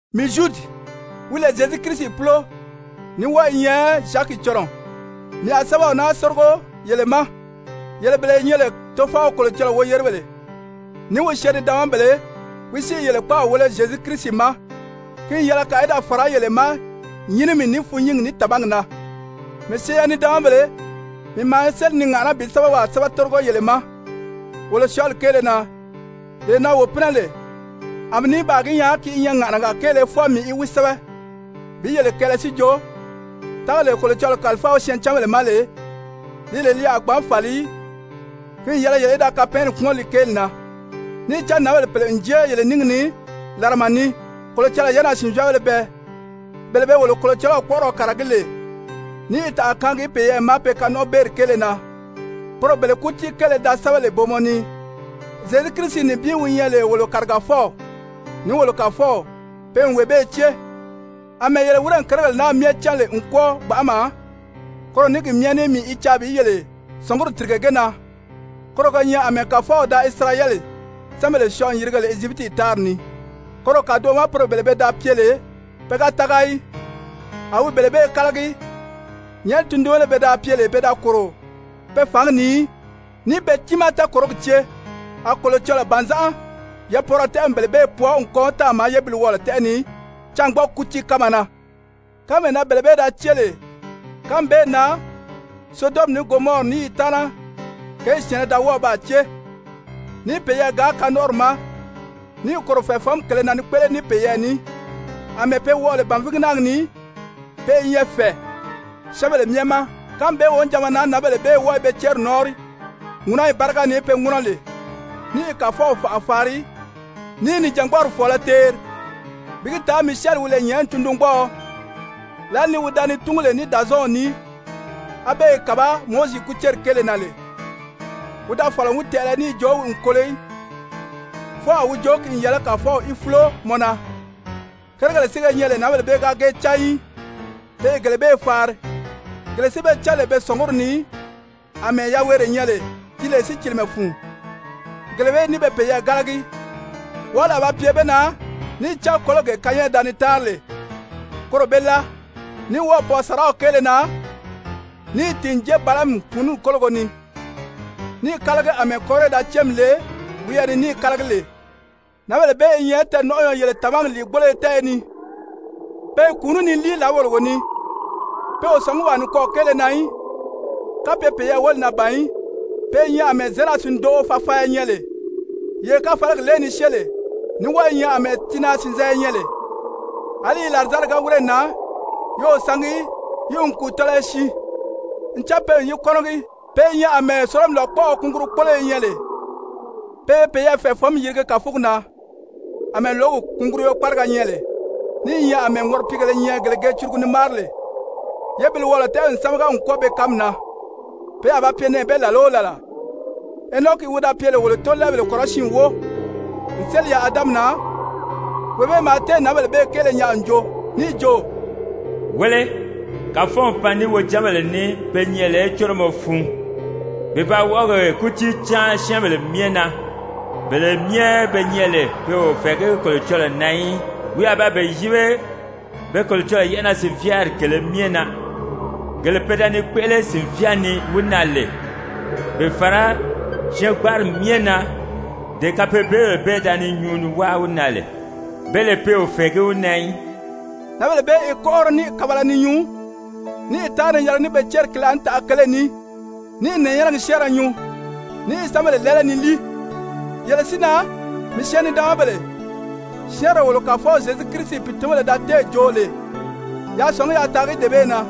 Mii Zyudi, wi lè Zyezu Kirisi púlo, ní wɔ́ɔ i nyɛ Zyaki cɔnɔɔ, mii a sɛ́bɛw naa tórigo yele ma, yele bele ye nyɛ lè Tofɔw Kolocɔlɔɔ woyeribéle, ní wi syɛɛn-nidaanmabéle, wi si i yele kpáaw wéle Zyezu Kirisi ma. Ki n yɛlɛ kàa í da fàrá yele ma nyínimi, ní fûnnyingi, ní tàmagi na! Mii syɛɛn-nidaanmabèle, mii maa séli ni ŋàʔaná bi sɛ́bɛwaa sɛ́bɛ tórigo yele ma wolo syɔɔli kéele na, lee na wo pínɛ lè, a mii ní baa gi nyaa ki i nyɛ ŋàʔanaga kéele fwɔɔ mii í wi sɛ́bɛ bi yele kɛɛlɛ si jo, tágalee Kolocɔlɔɔ kàlifáa wi syɛɛncanbèle ma lè, li lè li a gbǎn fàli í, ki n yɛlɛ yele í da kapɛɛnnɛ kpúmɔn li kéeli na. Níì cán nǎnbèle pèle n jée yele níngi ni làrama ni, Kolocɔlɔɔ yɛ́ʔɛnaa-sìnvyaabéle bɛɛ, bele be wolo Kolocɔlɔw kpɔ́ʔɔrɔ kàragí lè ni tànʔa kaangi peyɛɛ ma pe kanɔnʔɔbeeri kéele na, poro bele kútii kéele li da sɛ́bɛ lè booma ni, Zyezu Kirisi nibin wi nyɛ lè wolo Kàrigafɔw ní wolo Kàfɔw, pe n wee bee cée. Amɛɛ yele wírè kérigèle naa myɛ cán lè n kwɔ́ɔ gbanʔama, koro ní ki myɛ ní mii i caa bi yele sɔ̀ngumi tìrige ge na, koro ge nyɛ àmɛɛ Kàfɔw da Isirayɛli syɛ́ɛnbèle syɔɔ n yirige lè Ezyipiti tári ni, koro kàdoʔo ma poro bele pe da pye lè pe ga tága í, a wi bele bee kálagi. Nyɛ̀ʔɛni tundunbéle be pye lè pe da kòro pe fǎngi ni í, níì pe tiimaa tɛɛkòrogi cée, a Kolocɔlɔɔ bànzánʔa yapwɔɔrɔ tɛ́ʔɛ n bele bee pwɔɔ n kɔn táàma yébiliwɔɔlɔ tɛ́ʔɛ ni cângbɔɔgi kútii kánma na. Kánmee na bele bee da cée lè, kánmi bee na Sodɔmi, ní Gomɔri, ní yi taana kěyi syɛ̀ɛnnɛ da baa cée níì peyɛɛ gaan kanɔnʔɔri ma, níì kòro fɛ̀ɛfɔnmi kèlē na ni kpéʔele ní peyɛɛ ní. Amɛɛ be wɔʔɔ lè bànvigi náagi ni, pe i nyɛ fɛ̀ɛ syɛ́ɛnbèle myɛ ma. Kánmi bee wonijanma na nǎnbèle bee wɔ́ɔ i be céri nɔ́ɔnri ŋúnɔyi báriga ni be ŋúnɔ lè, ní i Kàfɔw fànʔa faari, ní i nìjangbɔɔri fɔ̀ɔlɔ teeri. Bi gi taa Misyɛli wi lè nyɛ̀ʔɛni tundungbɔɔɔ, lǎli ni wi da ni túngu lè ní Dàzɔɔnw ní, á be i kàbá Mowizi kúceri kéele na lè, wi da fɔ̀lɔ n wi tɛʔɛlɛ níì jo wi n kolo í, fwɔɔ a wi jo: «Ki n yɛlɛ Kàfɔw í fúlo mɔ na!» Kérigèle si ge nyɛ lè nǎnbèle bee ga ge cán í, pe i gele bee faari, gele si be cán lè be sɔ̀nguri ni àmɛɛ yaweere nyɛ lè di lè sícilimɛ fun, gele bee ní pe peyɛɛ gálagi. Wɔʔɔli a ba pye be na! Níì cán kólogee Kayɛn da ni táanri lè koro be láa, ní wɔ́ɔ̀ pwɔɔ sàraw kéele na níì tìn n jée Balaami pùununi kólogo ni, níì kálagi àmɛɛ Kore da céemi le wiyɛɛ ni níì kálagi lè. Nǎnbèle bee i nyɛ tɛɛ̀nɔnʔɔyɔ yele tàmagi lìigboloyo tɛ́ɛyɛ ni, pe i kùunú ni líi làáwologo ni, pe o sɔ̀ngí wàa nikwɔɔ kéele na í kapye peyɛɛ wóli na ban í, pe i nyɛ àmɛɛ zěnaa-sìndoʔo fafaanya nyɛ lè, yee káfalagi lée ni syée lè, ní wɔ́ɔ i nyɛ àmɛɛ tiinaa-sìnzanya nyɛ lè, àlí yi làrizanni ga wírè nan, yi o sangi í, yi n kùu tɔlɔyɔ siin, ncan pe n yi kɔ́nɔgi, pe i nyɛ àmɛɛ sólomi lòkpɔʔɔ kungurukpoloyo nyɛ lè, pe i peyɛɛ fɛ̀ɛfɔnmi yirigi kàfugi na àmɛɛ lǒgi kùnguruyo kpáriga nyɛ lè, ní i nyɛ àmɛɛ ŋɔripiigèlē nyɛ, gele ge curugu ni máari lè, yébiliwɔɔlɔ tɛ́ʔɛ n sámaga n kwɔ́ɔ be kánmi na, pe a ba pye nɛɛ bee làla o làla! Henɔki wi da pye lè wolo tóolɛɛbèle kɔrɔsiin wóo n séli yaà Adami na, wee bee maa téè nǎnbèle bee kéele nyaa n joo níì jo: «Wéle, Kàfɔw n pan ní wi wojanbèle ní pe nyɛ lè córomɔ fun, bi ba wɔʔɔgi kútii cáan syɛ́ɛnbèle myɛ na, bele myɛ be nyɛ lè pe o fɛ̀ɛgí Kolocɔlɔɔ na í, wi a ba be yíbe be Kolocɔlɔɔ yɛ́ʔɛnaa-sìnvyaari kèlē myɛ na, gele pe da ni kpéʔele sìnvyaa ni wi na lè, bi fàra syɛɛngbanri myɛ na, dee kapeebyebèle bee da ni nyuu ni wáa wi na lè, be lè pe o fɛ̀ɛgí wi na í.» Nǎnbèle bee i kɔ́nʔɔri ní i kabala ni nyuu, ní i táanri ni yɛlɛgi ní be céri ki laànitaʔa kele ní, ní i nɛ̀ɛnyɛnɛgi syɛ́ɛnrɛ nyuu, ní i syɛ́ɛnbèle lɛ́ɛlɛ ni líi. Yele si na, mii syɛɛn-nidaanmabèle, syɛ́ɛnree wolo Kàfɔw Zyezu Kirisi pìitunbèle da téè joo lè, yaa sɔ̀ngí yaa taagi dee bee na.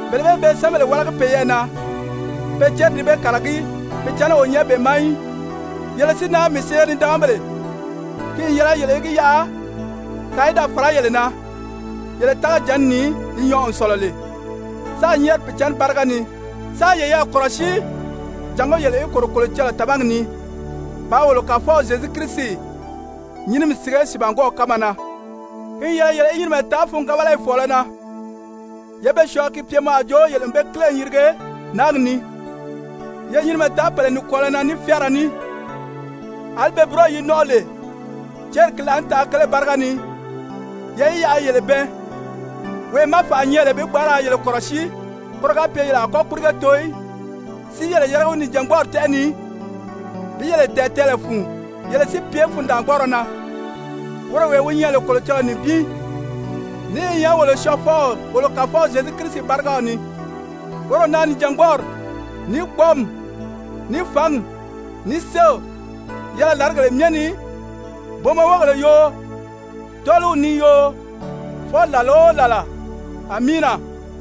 Bele bee be syɛ́ɛnbèle wálagi peyɛɛ na, pe céri di be kàragí, Pìicǎnni o nyɛ be ma í. Yele si na, mii syɛɛn-nidaanmabèle, ki n yɛlɛ yele í gi yaʔa kàa í da fàrá yele na yele tágajǎnni ni li nyɔɔ n sɔ̀lɔ lè, sáā nyɛ́ɛri Pìicǎnni báriga ni, sáā yeyɛɛ kɔ̀rɔsíi jàngó yele í kòro Kolocɔlɔɔ tàmagi ni, bàā wolo Kàfɔw Zyezu Kirisi nyínimi sige sìibangwɔɔw kánma na. Ki n yɛlɛ yele í nyinimɛ taa fûngabalayi fɔ̀ɔlɔ na, yé be syɔɔ ki pye mɔ a jo yele n be kíle n yirige náagi ni. Yé nyinimɛ taa pèle nikwɔɔlɔ na ní fyáara ní, àlí be búroyi yi nɔ́nʔɔ lè céri ki laànitaʔa kele báriga ni, ye yi yaʔa yi yele bɛɛn. Wee má fànʔa nyɛ lè bi gbǎn ra yele kɔ̀rɔsíi koro ga pye yele a kɔ́ kpírige too í, si yele yérige wi nìjangbɔɔri tɛ́ʔɛ ni bi yele tɛ̀ɛn tɛɛlɛ fun yele si pye fundaangbɔɔrɔ na, woro wee wi nyɛ lè Kolocɔlɔɔ nibin, ní i nyɛ wolo Syɔɔfɔw, wolo Kàfɔw Zyezu Kirisi bárigaw ni, woro na nìjangbɔɔri, ní kpɔ́ɔmi, ní fǎngi, ní séew yɛlɛ làrigèle myɛ ni, booma wógèle yoo, tɔ́ɔliw ni yoo, fwɔɔ làla o làla! Amiina!